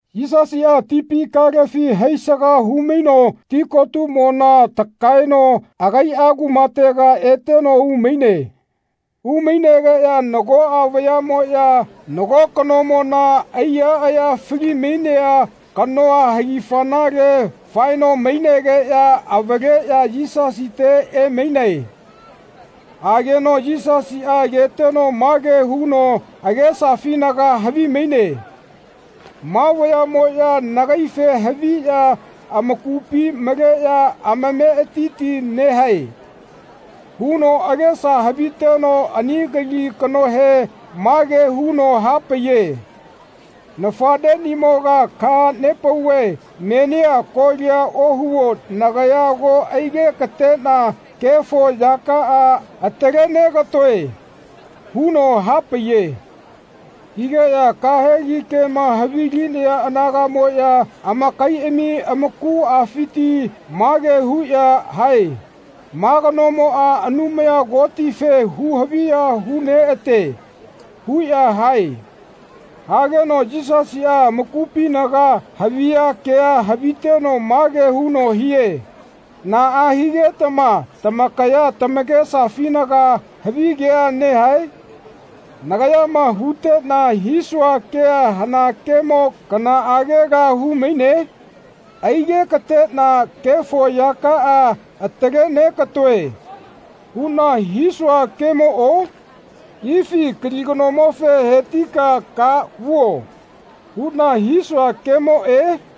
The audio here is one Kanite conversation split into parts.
Yisasiꞌa tipi kalefi haisaga hu-maino tikotumona takaeno agaiꞌa kumatega eteno umaine. Umainegeꞌya nagoꞌa vayaꞌmoꞌya nago kanomona aiya aya fali-mainea kanoa hagifanale faeno mainegeꞌya avaleꞌya Yisasite emainae. Ageno Yisasiꞌa ageteno mage huno agesafinaga havimaine “Ma vayaꞌmoꞌya nagaife haviꞌya amakupi maleꞌya amametiti nehae.” huno agesa haviteno ani kali kanohe mage huno hapaiye “Nafaꞌneꞌnimoga kaha-nepauve menia kolia ohuo nagaya ago aige-ka-teꞌna kefo yakaꞌa atale-nega-toe.” huno hapaiye. Higeꞌya kahegi kema havi-linaya anagaꞌmoꞌya amakaiꞌami amakuꞌafiti mage huꞌya hae “Ma kanomoꞌa Anumaya Kotife hu-haviya hu-neꞌate.” huꞌya hae. Hageno Yisasiꞌa amakupinaga haviya kea haviteno mage huno hie “Naꞌa higetama tamakaya tamakesafinaga havi kea nehae? Nagayama huteꞌna hisua kea hana kemo kanaꞌagela hu-maine? ‘Aige-ka-teꞌna kefo yakaꞌa atale-neka-toe.’ huꞌna hisua kemoꞌo? Ifi kali kanomofe ‘He-ti-ka ka vuo.’ huꞌna hisua kemoꞌe?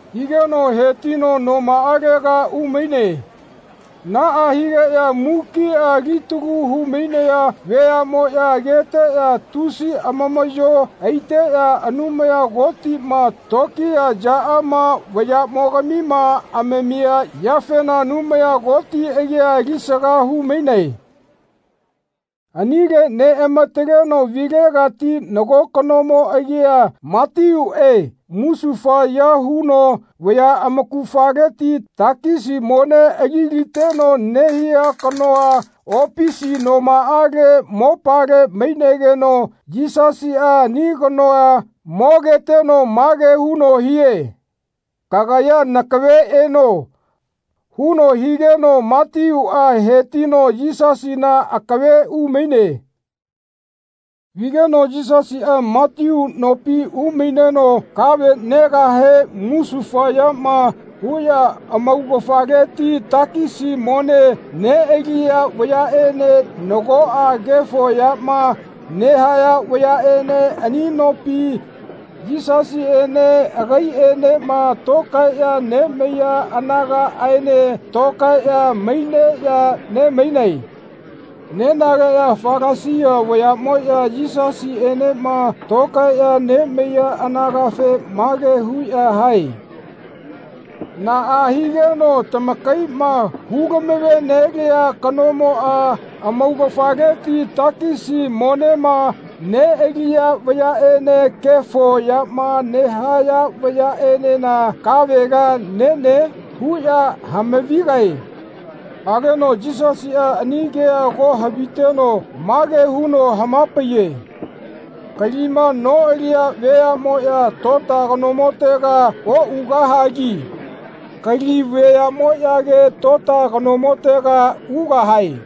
Higeno hetino nomaꞌalega umaine. Naꞌa higeꞌya mukiꞌa alitalu hu-mainaya veaꞌmoꞌya ageteꞌya tusi amamaꞌyo aiteꞌya Anumaya Kotiꞌma tokiya yaꞌama vayaꞌmogamima amamia yafena Anumaya Koti agia alisaga hu-mainae. Anile neꞌamataleno vilegati nago kanomo agia Matiuꞌe musufaya huno vaya amaugafaleti takisi mone ali-liteno nehia kanoa opisi nomaꞌale mopale mainegeno Yisasiꞌa ani kanoa mogeteno mage huno hie “Kagaya nakave eno.” huno higeno Matiuꞌa hetino Yisasina akave umaine. Vigeno Yisasiꞌa Matiu nopi umaineno kave negahe musufayama huꞌya amaugafaleti takisi mone neꞌaliya vayaꞌene nagoꞌa kefo yama nehaya vayaꞌene ani nopi Yisasiꞌene agaiꞌenema tokaeꞌya nemaiya anagaꞌaene tokaeꞌya maineꞌya ne-mainae. Nenageꞌya Falasia vayaꞌmoꞌya Yisasiꞌenema tokaeꞌya nemaiya anagafe mage huꞌya hae “Naꞌa higeno tamakaiꞌma hu-lamave-nelia kanomoꞌa amaugafaleti takisi monema neꞌaliya vayaꞌene kefo yama nehaya vayaꞌenena kavela nene?” huꞌya hama-vigae. Hageno Yisasiꞌa ani kea ago haviteno mage huno hama-paiye “Kalima noꞌaliya veaꞌmoꞌya tota kanomotega oꞌugahagi kali veaꞌmoꞌyage tota kanomotega ugahae.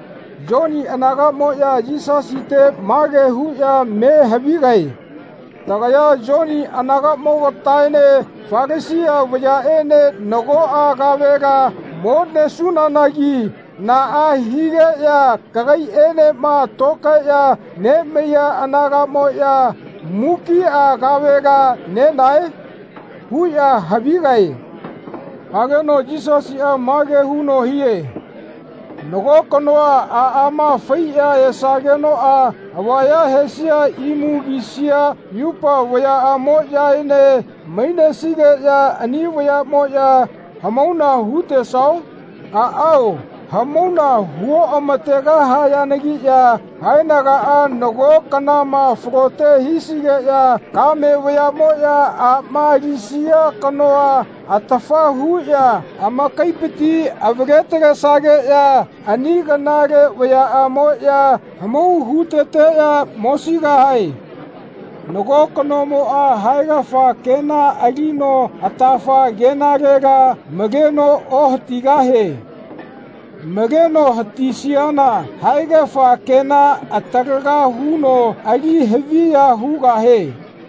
Yoni anagaꞌmoꞌya Yisasite mage huꞌya me havigae “Tagaya Yoni anagaꞌmogataene Falasia vayaꞌene nagoꞌa kavela mo-nesunanagi naꞌa higeꞌya kagaiꞌenema tokaeꞌya nemaiya anagaꞌmoꞌya mukiꞌa kavela nenae?” huꞌya havigae. Hageno Yisasiꞌa mage huno hie “Nago kanoa aꞌama faiꞌya esagenoꞌa avaya hesia imu kisia yupa vayaꞌamoꞌyaene mainesigeꞌya ani vayaꞌmoꞌya hamauna hu-tesao? Aꞌao hamauna hu-oꞌategahayanagiꞌya haenagaꞌa nago kanama falote hisigeꞌya kame vayaꞌmoꞌya aꞌma alisia kanoa atafa huꞌya amakaipiti avale-talesageꞌya ani kanale vayaꞌamoꞌya hamau hu-teteꞌya mosigahae. Nago kanomoꞌa haegafa kena alino atafa kenalela maleno ohatigahie. Maleno hatisiana haegafa kena atalaga huno ali haviya hugahie.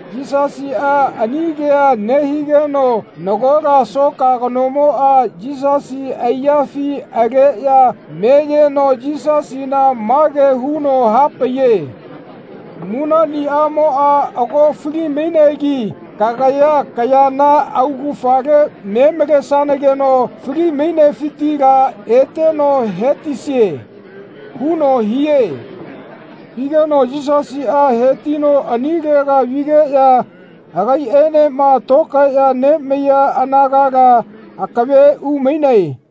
Yisasiꞌa ani kea nehigeno nagola soka kanomoꞌa Yisasi aiyafi aleꞌya meyeno Yisasina mage huno hapaiye “Munaꞌniꞌamoꞌa ago fali-mainegi kagaya kayana augafale me malesanageno fali-mainefitila eteno he-tisie.” huno hie. Higeno Yisasiꞌa hetino anilega vigeꞌya agaiꞌenema tokaeꞌya nemaiya anagala akave umainae.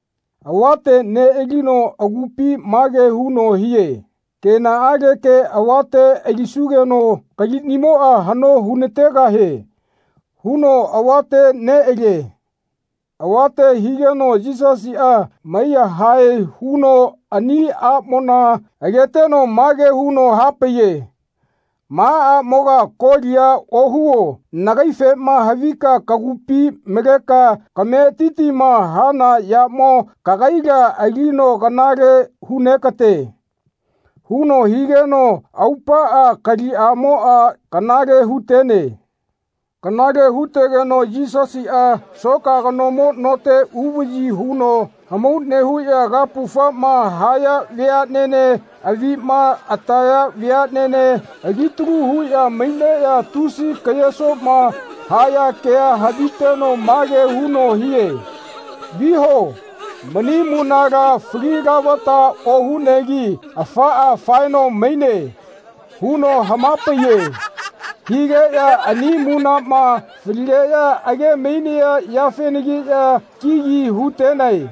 Avate neꞌalino agupi mage huno hie “Kenaꞌaleke avate alisugeno kaliꞌnimoꞌa haꞌno hu-nategahie.” huno avate neꞌalie. Avate higeno Yisasiꞌa mai-yahae huno ani aꞌmona ageteno mage huno hapaiye “Ma aꞌmoga kolia ohuo nagaifema havika kagupi maleka kametitima hana yamo kagaila alino kanale hu-negate.” huno higeno aupaꞌa kaliꞌamoꞌa kanale hu-tene. Kanale hu-tegeno Yisasiꞌa soka kanomo note uvaꞌyi huno hamau nehuꞌya kapufama haya veaꞌnene avima ataya veaꞌnene ali-talu huꞌya maineꞌya tusi ke-yesoma haya kea haviteno mage huno hie “Viho mani munala fali lavata ohunegi afaꞌa faeno maine.” huno hama-paiye. Higeꞌya ani munaꞌma faligeꞌya age-mainaya yafenagiꞌya kigi hu-tenae.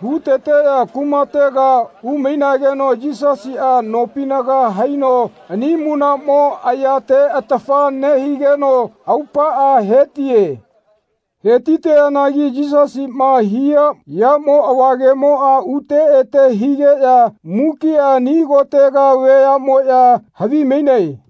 Hu-teteꞌya kumatega umainageno Yisasiꞌa nopinaga haino ani munaꞌmo ayate atafa nehigeno aupaꞌa hetie. He-ti-teanagi Yisasiꞌma hia yamo avagemoꞌa ute ete higeꞌya mukiꞌa ani kotega veaꞌmoꞌya havi-mainae.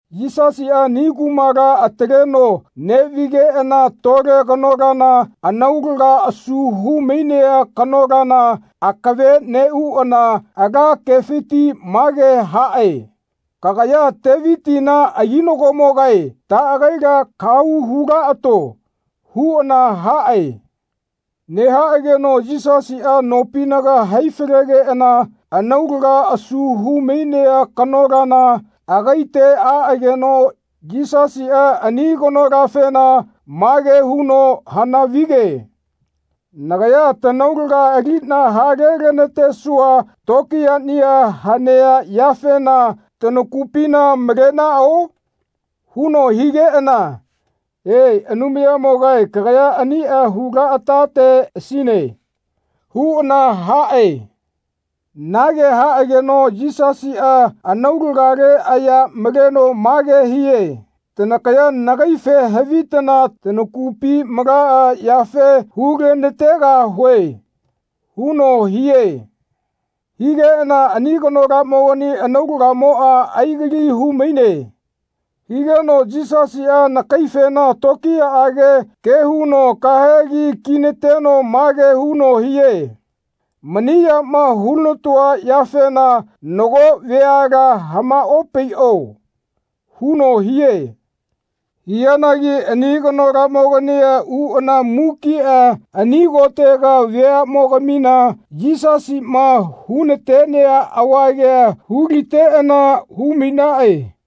Yisasiꞌa ani kumala ataleno neꞌvigeꞌana tole kanolana anaulaga asu hu-mainea kanolana akave neꞌuꞌana ala kefiti mage haꞌe “Kagaya Tevitina aginagomogae taꞌagaila kahau hu-laꞌato.” huꞌana haꞌe. Nehaꞌageno Yisasiꞌa nopinaga hai-falegeꞌana anaulaga asu hu-mainea kanolana agaite aꞌageno Yisasiꞌa ani kanolafena mage huno hana-vige “Nagaya tanaulaga aliꞌna hale-lanatesua tokiyaꞌnia hanea yafena tanakupina malenaꞌao?” huno higeꞌana “E, Anumayamogae kagaya aniꞌa hu-laꞌatateꞌasine.” huꞌana haꞌe. Nage haꞌageno Yisasiꞌa anaulagale aya maleno mage hie “Tanakaya nagaife havitana tanakupi malaꞌa yafe hu-lana-tegahue.” huno hie. Higeꞌana ani kanolamogani anaulagamoꞌa ai-gali hu-maine. Higeno Yisasiꞌa anakaifena tokiyaꞌage ke huno kahegi ki-nateno mage huno hie “Mani yama hu-lana-toa yafena nagoꞌa veala hamaꞌopaiꞌo.” huno hie. Hianagi ani kanolamogania uꞌana mukiꞌa ani kotega veaꞌmogamina Yisasiꞌma hu-na-tea avagea hu-liteꞌana hu-mainaꞌe.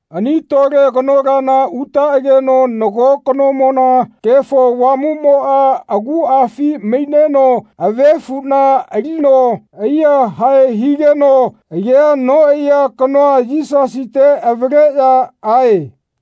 Ani tole kanolana utaꞌageno nago kanomona Kefo Avamuꞌmoꞌa aguꞌafi maineno avefuꞌna alino ai-yahae higeno agea noꞌaiya kanoa Yisasite avaleꞌya ae.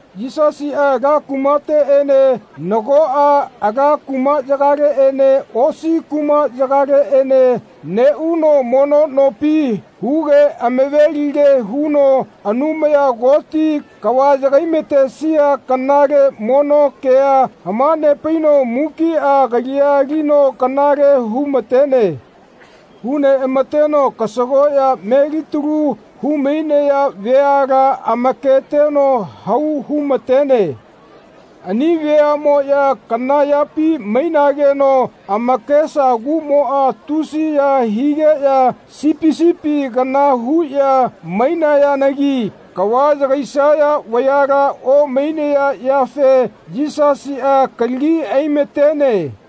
Yisasiꞌa ala kumateꞌene nagoꞌa ala kumaꞌyagaleꞌene osi kumaꞌyagaleꞌene neꞌuno mono nopi huge amave-lige huno Anumaya Koti kava yagai-ma-tesia kanale mono kea hama-nepaino mukiꞌa kalia alino kanale hu-ma-tene. Hu-neꞌama-teno kasagoꞌya melitalu hu-mainaya veala amaketeno hau hu-ma-tene. Ani veaꞌmoꞌya kana yapi mainageno amakesa kuꞌmoꞌa tusiya higeꞌya sipi sipi kana huꞌya mainayanagi kava yagaisaya vayala omainaya yafe Yisasiꞌa kalagi ai-matene.